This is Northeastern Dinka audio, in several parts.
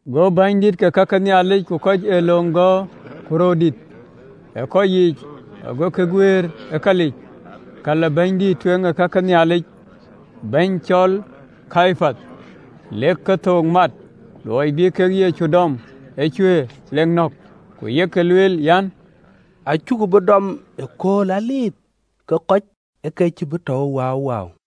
Go bänydït ke ka ke Nhialic ku kɔc ë löŋ gɔ̈ɔ̈r ku röördït ë kɔc yiic, agokï guëër ë kalic kal ë bɛ̈nydïït ë kake Nhialic bɛ̈ny cɔl Kayapath, lek kethook mat ë luɔi bï kek Yecu dɔm ë cuëër, ku bïk nɔ̈k. Ku yek lueel an, “Acuku bï dɔm ëkööl ë Dhuëëŋ, ke kɔc ë ke cïï bï lɔ waawaa.”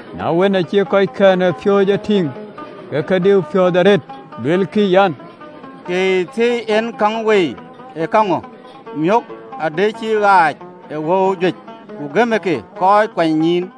Na wën, aacï kɔckɛn ë piööcë e tïŋ, ke ke diu piɔ̈ɔ̈th arëët, luelkï an, “Ee käŋö thiëi ë käŋ wei? Miökë adï cï ɣaac ë wëu juëc, ku gëm ë ke kɔc kuanynyïïn!”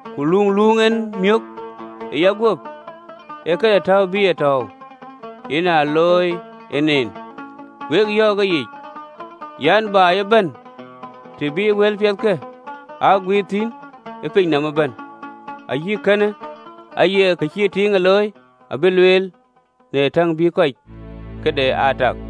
Kë luuŋ en miök ë yaguöp, ee këde täu bï a tɔ̈ɔ̈u, yen a looi en en. Wek yɔ̈ɔ̈k ëyic an, “Baai ëbɛ̈n të bï wëlpiɛthkë aa guiir thïn ë piny nɔm ëbɛ̈n, ayï kënë aya kë cïï tiiŋë looi abï lueel në täŋ bï kɔc këde aa tak.”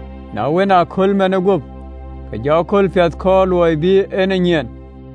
Na wën, ëkööl manë guöp, ke jɔ kööl piɛth kɔɔr, kööl bï en e nyiɛɛn.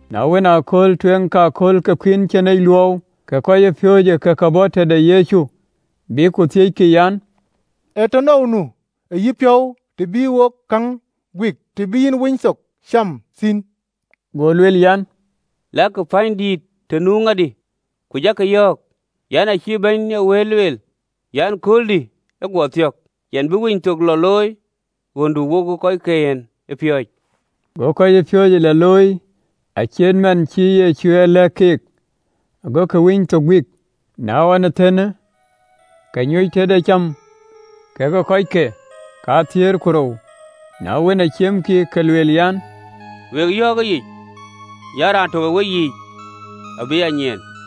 Na wën, ëkööl tueŋ ë akööl ke Dhuëëŋ de Kuïn Cïnic Luɔu, ke kɔcpiööcë ë ke bɔ̈ tëde Yecu, bïk ku thiëckï an, “Ee tënou nu ë yïpiɔ̈u të bï wo käŋ guik, të bï yïn Winythok cam thïn?” Go lueel an, “Lakï pänydït të nu ŋadï, ku jakï yɔ̈ɔ̈k an, “Acï Bɛ̈ny ë wëët lueel an, ‘Kööldï ë guɔ thiɔ̈k, yɛn bï Winythok lɔ looi ɣöndu wokë kɔckiën ë piööcë.”’ Go kɔcpiööcë lɔ looi acït man cï Yecu ye lɛ̈k keek, gokï Winythok guiir. Na ɣɔn thëën, ke nyuc tëde cäm kekë kɔckɛn piööcë kathiëër ku rou. Na wën, ciëm kek, ke lueel an, “Wek yɔ̈ɔ̈k ëyic an, raan tök ë weyiic abï a nyiɛɛn.”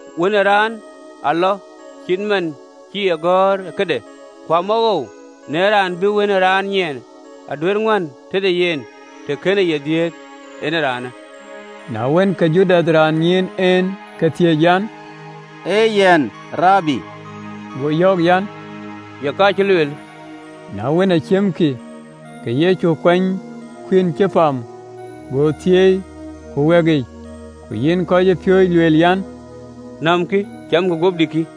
Wën ë Raan alɔ, cït man cï e gɔ̈ɔ̈r ë këde, ku amawoou në raan bï Wën ë Raan nyiɛɛn! Aduëër ŋuɛ̈ɛ̈n tëde yen, të kënë ye dhiëëth, en ëraanë!” Na wën, ke Judath, raan ë nyiin en, ke thiëëc an, “Ee yɛn, Rabi?” Go Yecu bɛ̈ɛ̈r an, “Ye ka, cï lueelë.” Na wën, aa ciëmkï, ke Yecu ë kuany kuïn cï pam, go thieei, ku wɛ̈ɛ̈kic, ku yïn kɔcpiööcë, lueel an, “Nämkï, camkï, guöpdï kï.”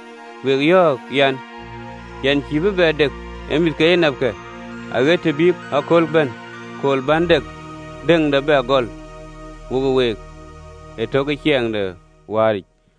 Wek yɔ̈ɔ̈k ëyic, Yɛn cïï bï bɛ dek në mïth ke enapkë, aɣët të bï akööl bɛ̈n, akööl bän dëŋde bɛ gɔl wokë week ëtök ë ciɛɛŋ de wääric.”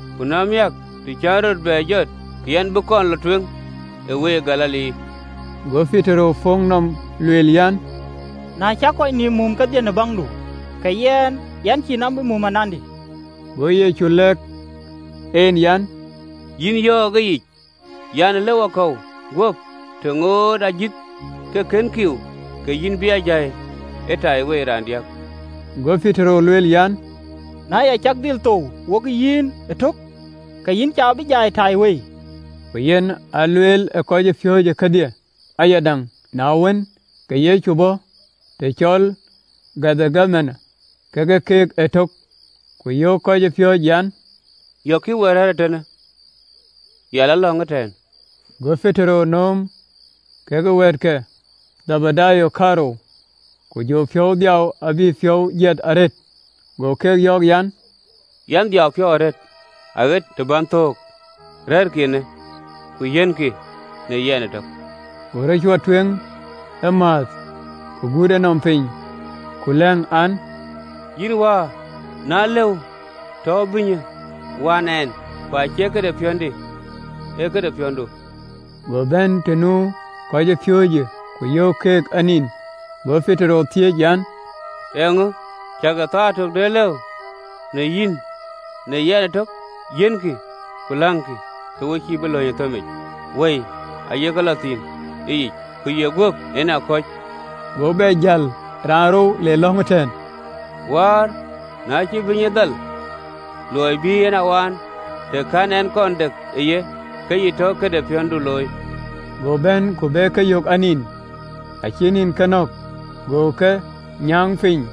Ku na miäk, të cän rɔt bɛ jɔt, ke yɛn bï kɔn lɔ tueŋ ë week Galili.” Go Petero puk nɔm, lueel an, “Na cak kɔc nïïm mum kedhie në baŋdu, ke yɛn cïï nɔm bï mum anandï!” Go Yecu lɛ̈k en an, “Yïn yɔ̈ɔ̈k ëyic an, ëlë wakɔ̈u guöp, të ŋoot ajïth ke kën kïïu, ke yïn bï a jai ë taiwei raandiäk.” Go Petero lueel an, “Na ya cak dhil thou wokë yïn ëtök, ke yïn cä bï jai ë taiwei!” Ku yen aa lueel kɔcpiööcë kɔ̈kkë kedhie ayadäŋ. Na wën, ke Yecu bɔ̈ të cɔl Gethemane kekë keek ëtök, ku yöök kɔcpiööcë an, “Yɔ̈kkï ë we rɛ̈ɛ̈r ee tënë, yɛn lɔ lɔ̈ŋ ëtɛ̈ɛ̈n.” Go Petero nööm kekë wɛ̈ɛ̈t ke Dhebedayo kaarou, ku jɔ piɔ̈u dhiau abï piɔ̈u jiɛth arëët. Go keek yɔ̈ɔ̈k an, “Yɛn dhiau piɔ̈u arëët, aɣët të bän thou, rɛ̈ɛ̈rkï eenë, ku yiɛ̈nkï në yɛn ëtök.” Go rɔt cuɔt tueŋ ëmääth, ku gut enɔm piny, ku lɛ̈ŋ an, “Yïn wäär, na lëu rɔt, tɔ bïnyë waan ɛn! Ku acie këde piɔ̈ndï, ee këde piɔ̈ndu.” Go bɛ̈n të nu kɔcpiööcë, ku yök keek a nin, go Petero thiëëc an, “Ee käŋö cäkï thaar tök duëër lëu në yïn në yɛn ëtök? Yiɛ̈nkï ku läŋkï, ke we cïï bï lɔ ë thëmic, wëi aye lɔ thïn ëyic, ku ye guöp en akɔ̈c.” Go bɛ jäl raanrou, le lɔ̈ŋ an, “Wäär, na cïï ee bïnyë dhal ë luɔi bï en a waan, të kɛ̈n ɛn kɔn dek ë ye, ke yï tɔ këde piɔ̈ndu loi.” Go bɛ̈n ku be ke yök anin, acïï nïn ke nɔ̈k. Go ke nyääŋ piny,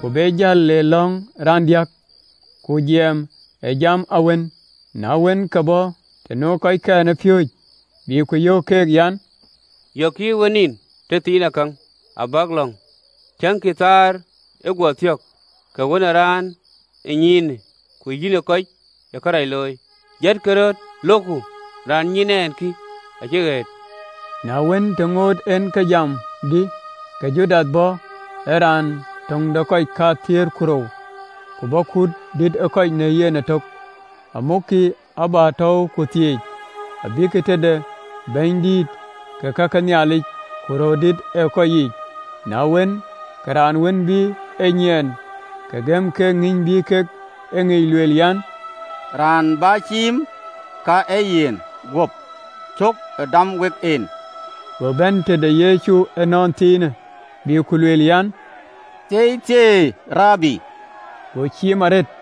ku be jäl, le lɔ̈ŋ raandiäk, ku jiɛɛm ë jam awën. Na wën, ke bɔ̈ të nu kɔckɛn ë piööcë, bï ku yöök keek an, “Yɔ̈kkï ë we nin tëthiinakäŋ, abäk lɔ̈ŋ, tiëŋkï! Thaar ë guɔ thiɔ̈k, ke Wën ë Raan ë nyiinë ku yïnë kɔc ë kërac looi. Jatkï röt, lokku, raan nyiin ɛn kï, acï ɣëët!” Na wën, të ŋoot en ke jam, dï, ke Judath bɔ̈, ee raan töŋ de kɔc kathiëër ku rou, ku bɔ̈ kut dïït ë kɔc në yen ëtök, amukkï abätɛ̈ɛ̈u ku thieec, abïkï tëde bänydït ke ka ke Nhialic ku röördït ë kɔc yiic. Na wën, ke raan wën bï e nyiɛɛn, ke gëm keek kïn bï kek e ŋic, lueel an, “Raan bä ciim, ka ee yen guöp, cök ë dam wek en.” Go bɛ̈n tëde Yecu ënɔnthiinë, bï ku lueel an, “Thieithieei ë yïn, Rabi,” go ciim arëët.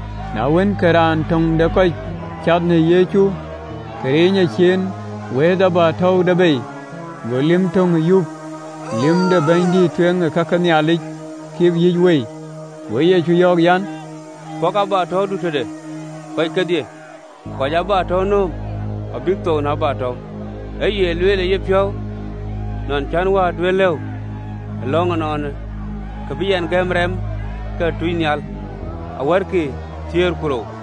Na wën, ke raan töŋ de kɔc cath në Yecu, ke riny ecin, wëëth abätäude bei, go lïm tök yup, lïm de bɛ̈nydïït ë kake Nhialic, kip yïc wei. Go Yecu yɔ̈ɔ̈k an, “Pɔ̈kë abätäudu tëde, kɔc kedhie kɔc ë abätäu nööm abïk thou në abätäu. Ë ye lueel ë yïpiɔ̈u nɔn cän Wäär duëër lëu ë lɔ̈ŋ ënɔɔnë, ku bï ɛn gäm rɛm ke tuucnhial wär thiëër ku rou?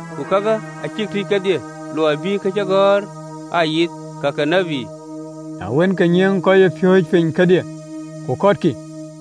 Ku kakë acïk tïc kedhie, luɔi bï kacïgɔ̈ɔ̈r aa yith, ka ke tït.” Na wën, ke nyiëëŋ ë kɔcpiööcë piny kedhie, ku kɔtkï.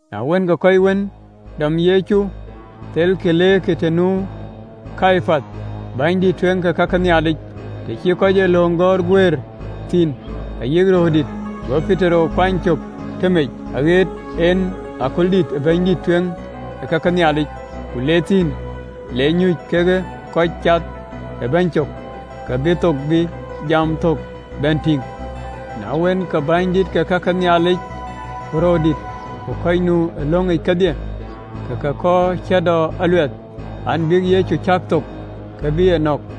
Na wën, ke kɔc wën dɔm Yecu, ke thelkï leerkï të nu Kayapath, bɛ̈nydïït ë kake Nhialic, të cï kɔc ë löŋ gɔ̈ɔ̈r guëër thïn ayï röördït. Go Petero kuany cök tëmec aɣëët en kaldïït ë bɛ̈nydïït ë kake Nhialic, ku le thïn, le nyuc kekë kɔc cath ë bɛ̈ny cök, ke bï thök bï jam thök bɛ̈n tïŋ. Na wën, ke bänydït ke ka ke Nhialic ku röördït ku kɔc nu ë löŋic kedhie, ke ke kɔɔr cäätɔɔ aluɛth an, bïk Yecu cäk thok, ke bï nɔ̈k,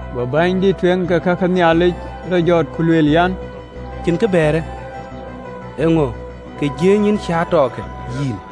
Go bɛ̈nydïït ë kake Nhialic rɔt jɔt, ku lueel an, “Cïn kë bɛ̈ɛ̈rë? Eeŋö ee kë jiëëny ë cäätɔɔkë yïn?”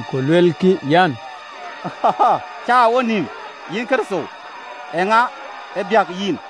ku luelkï an, “Cäär ë wonïïm, yïn Kërtho! Eeŋa ë biäk yïn!”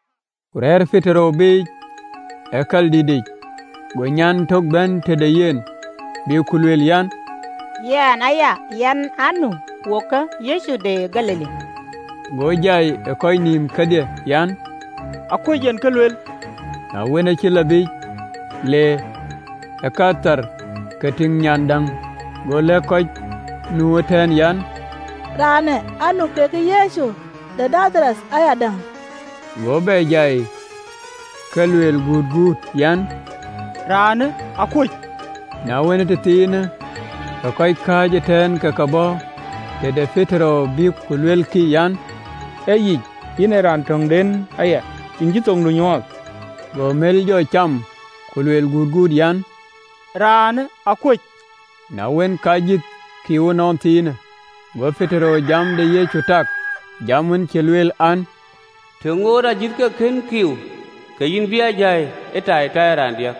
Ku rɛ̈ɛ̈r Petero biic ë kaldïtic, go nyan lïm tök bɛ̈n tëde yen, bï ku lueel an, “Yïn aya, yïn aa nu wekë Yecu de Galili.” Go jai ë kɔc nïïm kedhie an, “Akuöc yen kë luel.” Na wën, aacï lɔ biic le ë kät thar, ke tïŋ nyan lïm däŋ, go lɛ̈k kɔc nu ëtɛ̈ɛ̈n an, “Yen ee raanë aa nu kekë Yecu de Nadhareth ayadäŋ.” Go bɛ jai ke luel gutguut an, “Raanë akuöc.” Na wën, ee tëthiinë, ke kɔc kääc ëtɛ̈ɛ̈n ke ke bɔ̈ tëde Petero, bïk ku luelkï, an, “Ee yic, yïn ee raan töŋde aya, yïn cïï thoŋdu nyuɔɔth!” Go mël jɔ cam, ku jɔ kuëëŋ an, “Raanë akuöc!” Na wën, ke ajïth ë kiiu ënɔnthiinë, go Petero jam de Yecu tak, jam wën cï lueel an, “Të ŋoot ajïth ke kën kiiu, ke yïn bï a jai ëtaitai raandiäk.”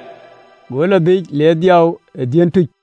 Go lɔ biic, le dhiau ë dhiën tuc.